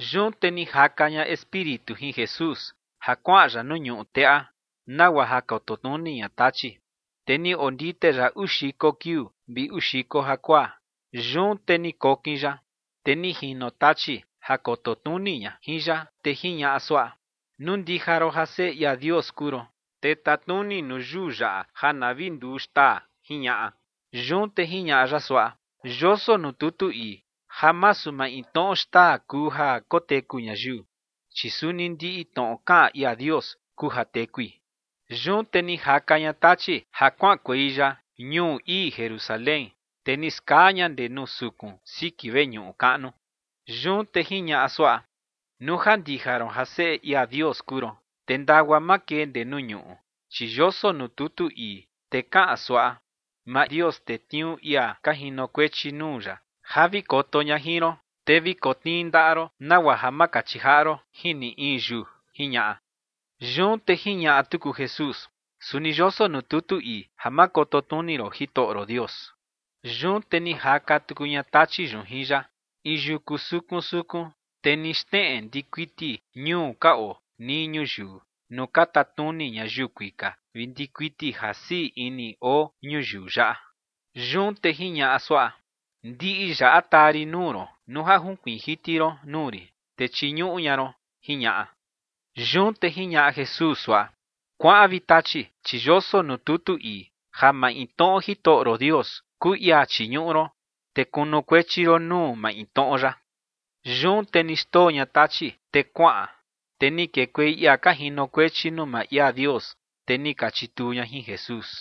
Yun te ni jaka ña Espíritu jin Jesús ja kuaꞌan ya nuu ñuꞌu teꞌa, nagua ja koto tnuni ña Tachi. Te ni ondite ya uu xiko kiuu vi uu xiko jakuaa, yun te ni kokin ya. Te ni jino Tachi ja koto tnuni ña jin ya, te jiñaꞌa suaꞌa: ͏―͏Nuu ndija ron ja Seꞌe ia Dios kuu ron, te tatnuni nuu yuu yaꞌa ja na vi nduu xtaa ͏―͏jiñaꞌa. Yun te jiñaꞌa ya suaꞌa: ͏―͏Yoso nuu tutu ii ja masu maintnoꞌo xtaa kuu ja koteku ñayiu, chi suni ndiꞌi tnoꞌo kaꞌan ia Dios kuu ja tekui. Yun te ni jaka ña Tachi ja kuaꞌankuei ya ñuu ii Jerusalén, te ni skaa ña ndee nuu sukun siki veñuꞌu kaꞌnu. Yun te jiñaꞌa suaꞌa: ͏―͏Nuu ja ndija ron ja Seꞌe ia Dios kuu ron, te ndagua makee ndee nuu ñuꞌu, chi yoso nuu tutu ii, te kaꞌan suaꞌa: “Maa Dios tetniuu ia ka jinokuechi nuu ya ja vi koto ña jin ron, te vi kotnii ndaꞌa ron nagua ja ma kachi jaꞌa ron jin ni in yuu”, ͏―͏jiñaꞌa. Yun te jiñaꞌa tuku Jesús: ͏―͏Suni yoso nuu tutu ii ja ma koto tnuni ron Jitoꞌo ron Dios. Yun te ni jaka tuku ña Tachi yun jin ya in yuku sukun sukun, te ni xneꞌe ndikuiti ñuu ka oo nii ñuyiu nuu ka tatnuni ñayiu kuika vi ndikuiti ja sii ini oo ñuyiu yaꞌa. Yun te jiñaꞌa suaꞌa: ͏―͏Ndiꞌi yaꞌa taa rin nuu ron nuu ja junkuiin jiti ron nuu rin, te chiñuꞌu ña ron ͏―͏jiñaꞌa. Yun te jiñaꞌa Jesús suaꞌa: ͏―͏Kuaꞌan, vi Tachi, chi yoso nuu tutu ii ja maintnoꞌo Jitoꞌo ron Dios kuu ia chiñuꞌu ron, te kunukuechi ron nuu maintnoꞌo ya. Yun te ni xndoo ña Tachi, te kuaꞌan. Te ni kekuei ia ka jinokuechi nuu maa ia Dios, te ni ka chituu ña jin Jesús.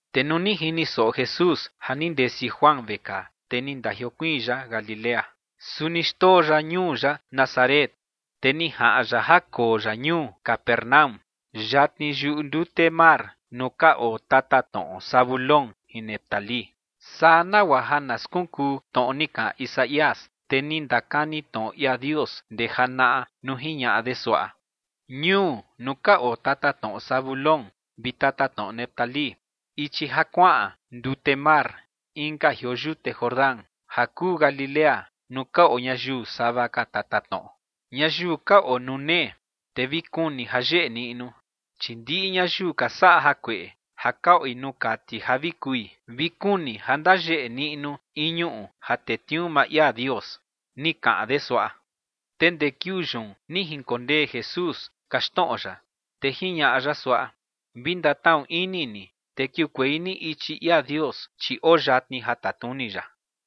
Te nuu ni jini soꞌo Jesús ja ni ndesi Juan vekaa, te ni ndajiokuiin ya Galilea. Su ni xndoo ya ñuu ya Nazaret, te ni jaꞌan ya ja koo ya ñuu Capernaúm, yatni yuꞌu ndute mar nuu ka oo tatatnoꞌo Zabulón jin Neftalí. Saa nagua ja na skunkuu tnoꞌo ni kaꞌan Isaías, tee ni ndakani tnoꞌo ia Dios ndee janaꞌa nuu jiñaꞌa de suaꞌa: Ñuu nuu ka oo tatatnoꞌo Zabulón vi tatatnoꞌo Neftalí, ichi ja kuaꞌan ndute mar inka jioo yute Jordán ja kuu Galilea nuu ka oo ñayiu sava ka tatatnoꞌo, ñayiu ka oo nuu nee, te vi kuni ja yeꞌe niꞌnu. Chi ndiꞌi ñayiu ka saꞌa jakueꞌe ja ka oi nuu kati ja vi kui, vi kuni ja ndayeꞌe niꞌnu in ñuꞌu ja tetniuu maa ia Dios, ni kaꞌan de suaꞌa. Te ndee kiuu yun ni jinkondee Jesús kaxtnoꞌo ya, te jiñaꞌa ya suaꞌa: ͏―͏Vi ndatnaꞌu ini ni, te kiukuei ni ichi ia Dios, chi oo yatni ja tatnuni ya.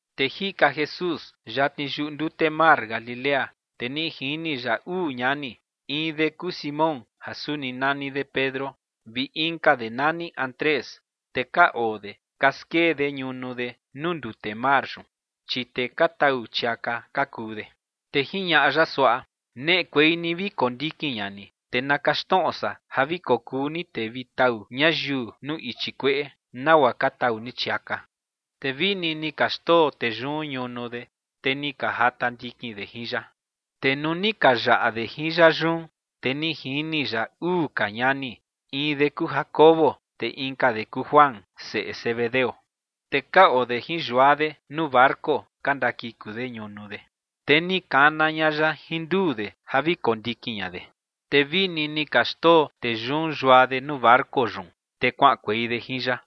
Te jika Jesús yatni yuꞌu ndute mar Galilea, te ni jini ya uu ñani, in de kuu Simón ja suni nani de Pedro, vi inka de nani Andrés. Te ka oo de ka skee de ñunu de nuu ndute mar yun, chi tee ka tau chiaka ka kuu de. Te jiñaꞌa ya suaꞌa: ͏―͏Neꞌekuei ni vi kondikin ña ni, te na kaxtnoꞌo san ja vi kokuu ni tee vi tau ñayiu nuu ichi kueꞌe, nagua ka tau ni chiaka. Te vini ni ka xndoo tee yun ñunu de, te ni ka jata ndikin ña de jin ya. Te nuu ni ka yaꞌa de jin ya yun, te ni jini ya uu ka ñani, in de kuu Jacobo, te inka de kuu Juan, seꞌe Zebedeo, te ka oo de jin yua de nuu barco ka ndakiku de ñunu de. Te ni kana ña ya jin nduu de ja vi kondikin ña de. Te vini ni ka xndoo tee yun yua de nuu barco yun, te kuaꞌankuei de jin ya.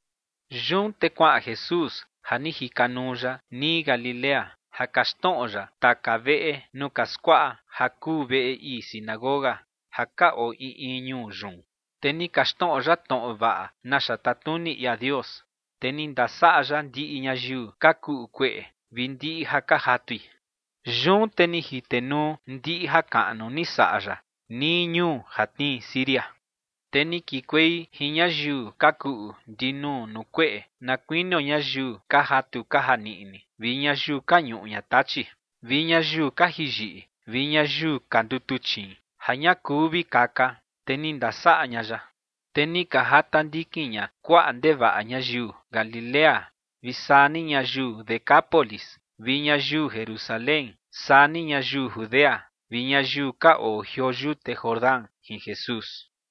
Yun te kuaꞌan Jesús ja ni jika nuu ya nii Galilea ja kaxtnoꞌo ya taka veꞌe nuu ka skuaꞌa ja kuu veꞌe ii sinagoga ja ka oo in in ñuu yun. Te ni kaxtnoꞌo ya tnoꞌo vaꞌa naxa tatnuni ia Dios, te ni ndasaꞌa ya ndiꞌi ñayiu ka kuꞌu kueꞌe vi ndiꞌi ja ka jatui. Yun te ni jitenuu ndiꞌi jakaꞌnu ni saꞌa ya nii ñuu ja tnii Siria. Te ni kikuei jin ñayiu ka kuꞌu ndinuu nuu kueꞌe na kuinio ñayiu ka jatu ka janiꞌni vi ñayiu ka ñuꞌu ña tachi, vi ñayiu ka jiꞌi yiꞌi vi ñayiu ka ndutuchiin ja ña kuu vi kaka, te ni ndasaꞌa ña ya. Te ni ka jata ndikin ña kuaꞌa ndevaꞌa ñayiu Galilea vi saa ni ñayiu Decápolis, vi ñayiu Jerusalén, saa ni ñayiu Judea vi ñayiu ka oo jioo yute Jordán jin Jesús.